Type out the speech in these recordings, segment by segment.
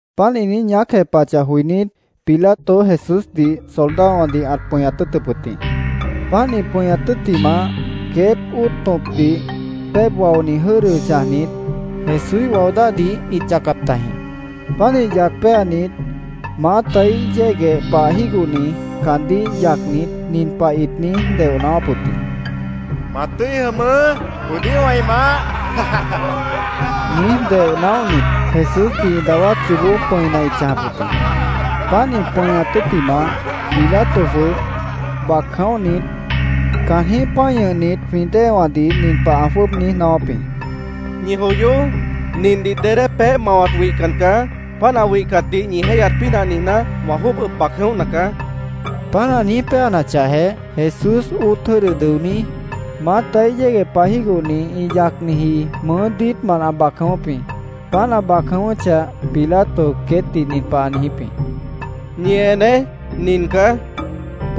Páant ĩ niíj ñaác jepahachah joinít, Pilato Jesúsdih soldadowãdih ãt pʉñat tʉ́ʉtʉp wʉt jĩ. Páant ĩ pʉñat tʉ́ttimah, queét óot tõpdih péeb waoni jʉ́dʉ chãjnit, Jesúíh wao dáhdih ĩt yacap tajĩ. Pánih yac péanit, maátaíh yégueh pah jígohni caandíh yacnit, nin pah ĩt niíj deoh naáwáp wʉt jĩ: —Ma tʉ́i jʉmʉʉ́, judíowã ĩ maáh, niíj deoh naóhnit, Jesúsdih ĩ dawát yoobó pʉ̃ina ĩt chãjap wʉt jĩ. Páant ĩ pʉñat tʉ́ttimah, Pilato jwʉ́ʉb bac jʉ̃óhnit, caanjĩ́h pã́i ñʉhnit jwĩ déewãdih nin pah ã jwʉ́ʉb niíj naáwáp jĩ: —Ñi joyoó. Nindih dedé peéh mawat wihcan caá. Páant ã wihcatdih ñi jéihyat pínah niijná, wã jwʉ́ʉb ʉb bac jʉ̃óhna caá, ã niijíp jĩ. Páant ã niíj péanachahjeh, Jesús óot jʉ́dʉ dʉoní, maátaíh yégueh pah jígohni ĩ yacniji mʉʉ́ diítmant ã bac jʉ̃ʉ́wʉ́p jĩ. Páant ã bac jʉ̃ʉ́wʉ́chah, Pilato queétdih nin pah ã niijíp jĩ: —Ñi eneé. Nin caá, ã niijíp jĩ.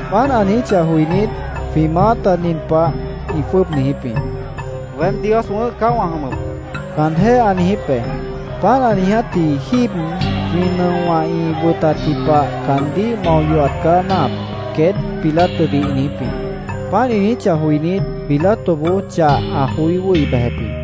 Páant ã niijíchah joinít, jwĩ maáta nin pah ĩ jwʉ́ʉb niijíp jĩ: —‘Weém Dios wʉ̃ʉ́h caá wã jʉmʉp’, caanjéh ã niijíp be. Páant ã niijátji jíib jwĩ nʉowã ĩ wʉtatji pah caandíh mao yohat caá náahap, queét Pilatodih ĩ niijíp jĩ. Páant ĩ niijíchah joinít, Pilatoboó chah ã joí wʉ́hi bejep jĩ.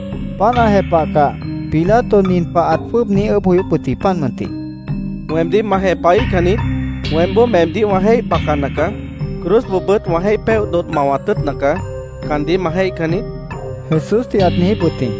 Páant ã jepahcah, Pilato nin pah ãt jwʉ́ʉb niíj ʉʉ́bh joyóp wʉt jĩ, páant mʉntih: —¿Weemdíh ma jepahíhcan niít? Weémboó meemdíh wã jéih bacana caá. Cruzboobʉ́t wã jéih péoh dodh mawat tʉ́ʉtna caá. ¿Caandíh ma jéihcan niít? Jesúsdih ãt niijíp wʉt jĩ.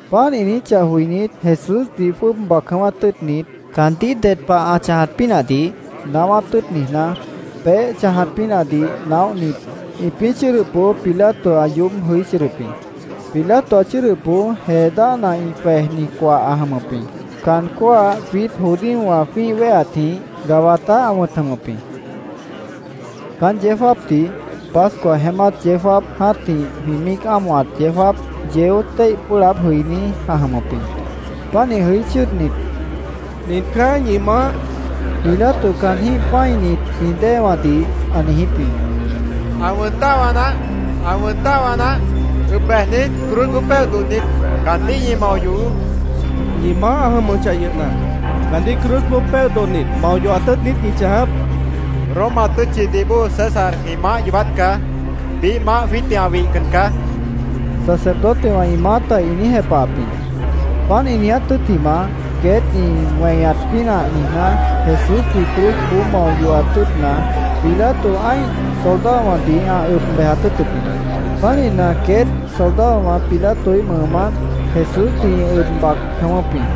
Páant ĩ niijíchah joinít, Jesúsdih jwʉ́ʉb bac jʉ̃ʉ́wát tʉ́ʉtnit, caandíh ded pah ã chãjat pínahdih naáwát tʉ́ʉt niijná, peéh chãjat pínahdih naóhnit ĩpĩ́ chʉ́ʉdʉpboó Pilato ã yoób jʉí chʉ́ʉdʉp jĩ. Pilato ã chʉ́ʉdʉpboó jee dáhna ĩ jwejni coah ã jʉmʉp jĩ. Caan cóah jwiít judíowã jwĩ́ih wéheatjĩh Gabatá ã wʉ̃t jʉmʉp jĩ. Caán yeó jáapdih Pascua jeémát yeó jáap jã́tih jwĩ míic ámohat yeó jáap, yeó téih pʉ́ʉh laáb jʉiní ã jʉmʉp jĩ. Pánih jʉí chʉ́ʉdnit, —Nin caá ñi maáh, Pilato caanjĩ́h pã́init jwĩ déewãdih ã niijíp jĩ. —¡Ã wʉn dáhwa naáh! ¡Ã wʉn dáhwa naáh! ¡Ʉb bejnit, cruzboó péoh dodhnit, caandíh ñi mao yohoó! ĩ niíj ñaacáp jĩ. —¿Ñi maáh ã jʉmʉchah yʉhna, caandíh cruzboó péoh dodhnit, mao yohat tʉ́ʉt niít ñi chãjap? Pilato queétdih ã niíj jepahap jĩ. —Roma tʉ́tchidih bóo César jwĩ maáh yoobát caá. Biíh maáh jwiítdih ã wihcan caá, sacerdotewã ĩ maáta ĩ niíj jepahap jĩ. Páant ĩ niiját tʉ́ttimah, queét ĩ weñat pínah niijná, Jesúsdih cruzboó mao yohat tʉ́ʉtna, Pilato ã́ih soldadowãdih ã ʉb bejat tʉ́ʉtʉp jĩ. Pánihna, queét soldadowã Pilatoíh mʉʉmánt Jesúsdih ĩ ʉb bac jʉ̃ʉ́wʉ́p jĩ.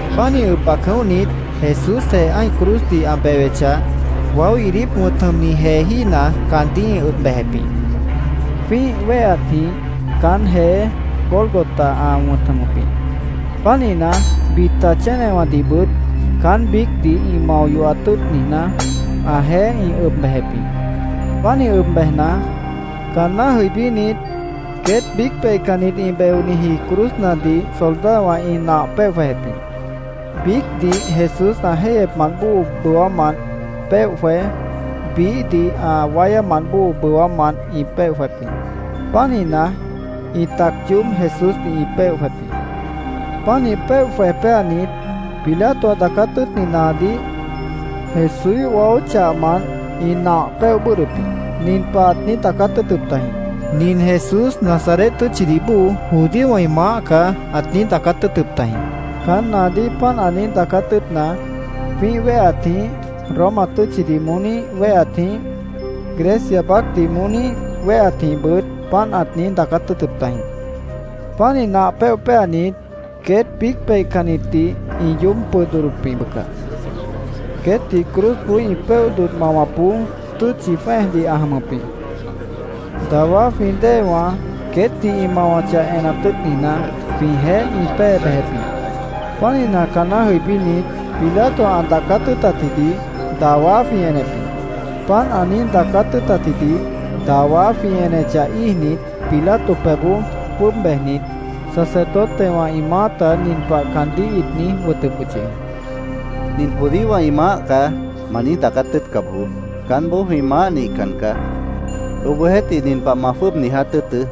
Pánih ʉb bac jʉ̃óhnit, Jesúsjeh ã́ih cruzdih ã bewechah, Waó Iidíp wʉ̃t jʉmni jeejína caandíh ĩ ʉb bejep jĩ. Jwĩ́ih wéheatjĩh caán jeé Gólgota ã wʉ̃t jʉmʉp jĩ. Pánihna, bita chénewãdihbʉt caán biícdih ĩ mao yohat tʉ́ʉt niijná, ãjeéh ĩ ʉb bejep jĩ. Pánih ʉb bejna, caanná jʉibínit, queét biíc peihcannit ĩ beoniji cruznadih soldadowã ĩ nah péoh jwejep jĩ. Biícdih Jesús ã jéihyepmant bóo bʉwámant péoh jwej, biíhdih ã wáyámant bóo bʉwámant ĩ péoh jwejep jĩ. Pánihna, ĩ tac yoób Jesúsdih ĩ péoh jwejep jĩ. Pánih péoh jwej péanit, Pilato ã daacát tʉ́ʉtni naadíh Jesúíh waó chahmant ĩ nah péoh bʉ́ʉdhdʉp jĩ. Nin pah ãt niíj daacát tʉ́ʉtʉp tajĩ: “Nin Jesús Nazaret tʉ́tchidih bóo judíowã ĩ maáh caá”, ãt niíj daacát tʉ́ʉtʉp tajĩ. Caán naadíh páant ã niíj daacát tʉ́ʉtna, jwĩ́ih wéheatjĩh, Roma tʉ́tchidih moóníh wéheatjĩh, Grecia baácdih moóníh wéheatjĩhbʉt páant ãt niíj daacát tʉ́ʉtʉp tajĩ. Pánih nah péoh péanit, queét biíc peihcannitdih ĩ yoób pʉd dodhdop jĩ, bʉca. Queétdih cruzboó ĩ péoh dodh mawapboó tʉ́tchi jwẽ́ejdih ã jʉmʉp jĩ. Dawá jwĩ déewã queétdih ĩ mawachah enat tʉ́ʉt niijná, jwĩjeéh ĩ pée bejep jĩ. Pánihna, caanná jʉibínit, Pilato ã daacát tʉ́ʉtatjidih dawá jwĩ enep jĩ. Páant ã niíj daacát tʉ́ʉtatjidih dawá jwĩ enechah íijnit, Pilato pebhboó jwʉ́ʉb bejnit, sacerdotewã ĩ maáta nin pah caandíh ĩt niíj wʉtʉp wʉt yʉh jĩ: —‘Nin judíowã ĩ maáh caá’, ma niíj daacát tʉ́ʉtca bojoó. Caánboó jwĩ maáh nihcan caá. Obohjeéhtih, nin pah ma jwʉ́ʉb niíj daacát tʉ́ʉtʉ́: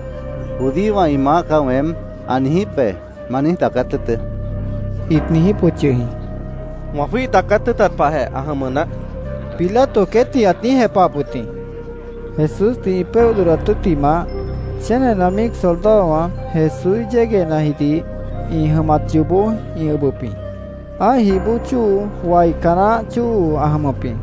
‘“Judíowã ĩ maáh caá weém”, ã niijíp be’, ma niíj daacát tʉ́ʉtʉ́, ĩt niijíp wʉt yʉh jĩ. —Wã jwíih daacát tʉ́ʉtat pahjeh ã jʉmʉ naáh, Pilato queétdih ãt niíj jepahap wʉt jĩ. Jesúsdih ĩ péoh dodhdat tʉ́ttimah, chénena míic soldadowã Jesúíh yéguehnajidih ĩ jʉmat yoobó ĩ ʉbʉp jĩ. Ã́ih jih bóo chóo, waica naáh chóo ã jʉmʉp jĩ.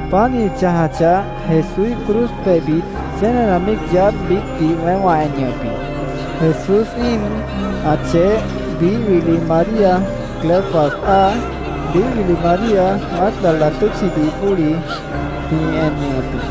Páant ĩ chãjachah, Jesúíh cruz pebhbit chénena míic yaádh biícdih weém wã en ñʉhʉp jĩ. Jesús íin, ã cheh, biíh wili María Cleofas áa, biíh wili María Mágdala tʉ́tchidih bóli jwĩ en ñʉhʉp jĩ.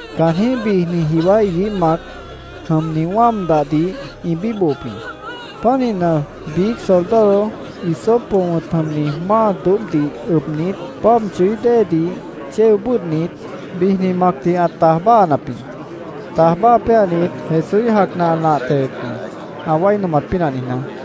Caanjĩ́h bijni jiwá iguíh mac jʉmni wáam dahdih ĩ bíbohop jĩ. Pánihna, biíc soldado hisopo wʉ̃t jʉmni máa doóbhdih ʉbnit, páab chʉí déedih chéo bʉ́ʉdhnit, bijni macdih ã taj báahanap jĩ. Taj báaha péanit, Jesúíh jacna ã nah tewep jĩ, ã wái nomat pínah niijná.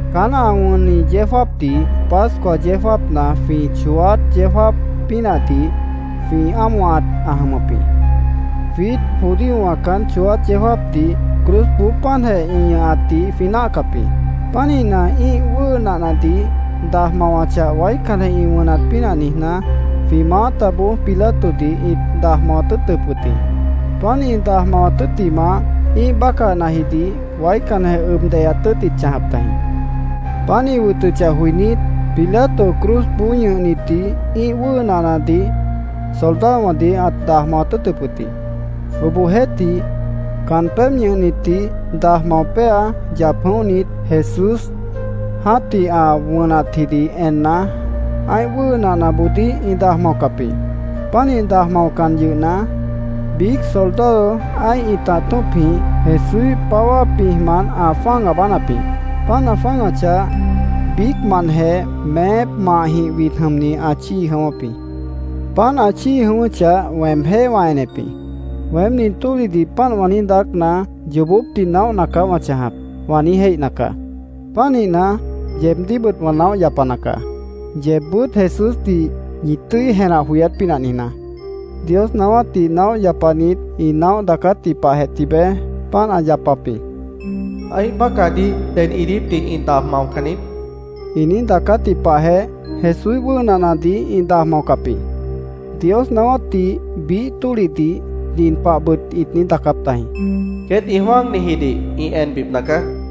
Caán ã wʉnni yeó jáapdih, Pascua yeó jáapna jwĩ chooát yeó jáap pínahdih jwĩ ámohat ã jʉmʉp jĩ. Jwiít judíowã caán chooát yeó jáapdih cruzboó páantjeh ĩ ñʉhatdih jwĩ náahcap jĩ. Pánihna, ĩ́ih wʉ́ʉ nahnadih daj mawachah, waícanjeh ĩ wʉnat pínah niijná, jwĩ maátaboó Pilatodih ĩt daj mawat tʉ́ʉtʉp wʉt jĩ. Páant ĩ daj mawat tʉ́ttimah, ĩ́ih bácahjidih waícanjeh ʉb deyaat tʉ́ʉt ĩt chãjap tajĩ. Páant ĩ wʉtʉchah joinít, Pilato cruzboó ñʉhnitdih ĩ́ih wʉ́ʉ nahnadih soldadowãdih ãt daj mawat tʉ́ʉtʉp wʉt jĩ. Obohjeéhtih, caan pébh ñʉhnitdih daj mao péa, yap jʉ̃óhnit, Jesús jã́tih ã wʉnatjidih enna, ã́ih wʉ́ʉ nahnaboodíh ĩ daj maocap jĩ. Pánih daj maocan yʉhna, biíc soldado ã́ih ĩtah tṍopjĩh Jesúíh páwá pĩjmant ã jwã́ag aabánap jĩ. Páant ã jwã́agachah, biícmantjeh meép mahjĩh wid jʉmni ã chíi jʉ̃ʉ́wʉ́p jĩ. Páant ã chíi jʉ̃ʉ́wʉ́chah, weemjéh wã enep jĩ. “Weém nin tólihdih páant wã niíj daácna, yoobópdih naóhna caá wã chãjap”, wã niíj jéihna caá. Pánihna, yeebdíhbʉt wã naóh yapana caá, yeebbʉ́t Jesúsdih ñi tʉ́i jenah joyát pínah niijná. Dios naáwátdih naóh yapanit ĩ naóh daacátji pahjeh tibeé páant ã yapap jĩ. “Ã́ih bácahdih ded iidípdih ĩ daj maocan niít”, ĩ niíj daacátji pahjeh, Jesúíh wʉ́ʉ nahnadih ĩ daj maocap jĩ. Dios naáwátdih biíh tólihdih nin pahbʉt ĩt niíj daacáp tajĩ: “Queét ĩ jwã́agnijidih ĩ enbipna caá”, ĩt niíj daacáp tajĩ.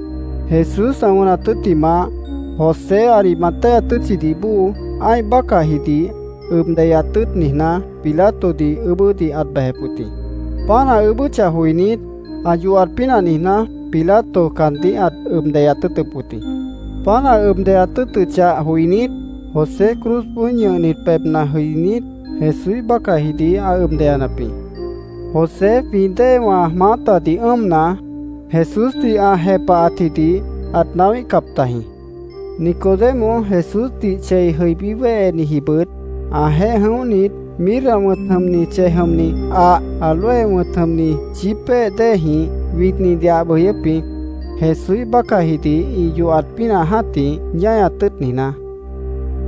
Jesús ã wʉnat tʉ́ttimah, José Arimatea tʉ́tchidih bóo, ã́ih bácahjidih ʉb deyaat tʉ́ʉt niijná, Pilatodih ʉʉ́bʉ́dih ãt bejep wʉt jĩ. Páant ã ʉʉ́bʉ́chah joinít, ã yohat pínah niijná, Pilato caandíh ãt ʉb deyaat tʉ́ʉtʉp wʉt jĩ. Páant ã ʉb deyaat tʉ́ʉtʉchah joinít, José cruzboó ñʉhnit pebhna jʉinít, Jesúíh bácahjidih ã ʉb deyanap jĩ. José jwĩ déewã maátadih ʉ́ʉmna, Jesúsdih ã jepahatjidih ãt naáwíhcap tajĩ. Nicodemo, Jesúsdih chei jʉí wéhenijibʉt, ãjeéh jʉ̃óhnit, mirra wʉ̃t jʉmni chej jʉmni ah, áloe wʉ̃t jʉmni chípéh déejĩh widnidih ã ʉb jʉyʉ́p jĩ, Jesúíh bácahjidih ĩ yohat pínah jã́tih ñáñat tʉ́ʉt niijná.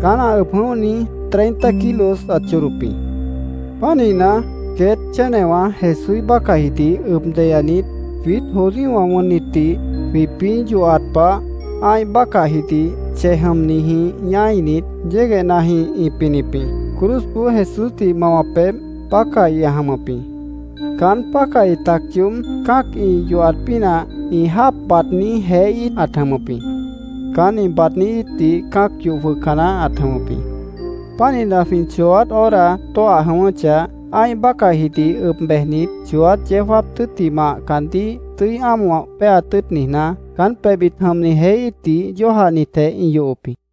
Caán ã ʉb jʉ̃óhni treinta kilos ãt chodop jĩ. Pánihna, queét chénewã Jesúíh bácahjidih ʉb deyanit, jwiít judíowã wʉnnitdih jwĩpĩ́ yohat pah, ã́ih bácahjidih chej jʉmnijĩh ñáinit, yéguehnajĩh ĩ pinip jĩ. Cruzboó Jesúsdih ĩ mawap pebh pácahi ã jʉmʉp jĩ. Caán pácahi tac yoób cã́ac ĩ yohat pínah ĩ jáap baadní jeé íit ãt jʉmʉp jĩ. Caán ĩ baadní íitdih cã́ac yoh jwʉhca naáh ãt jʉmʉp jĩ. Pánihna, jwĩ chooát hora tóah jʉ̃ʉ́wʉ́chah, ã́ih bácahjidih ʉb bejnit, chooát yeó jáap tʉ́ttimah caandíh tʉ́i ámoh péaat tʉ́ʉt niijná, caán pebhbit jʉmni jeé íitdih yójahnitjeh ĩ yohop jĩ.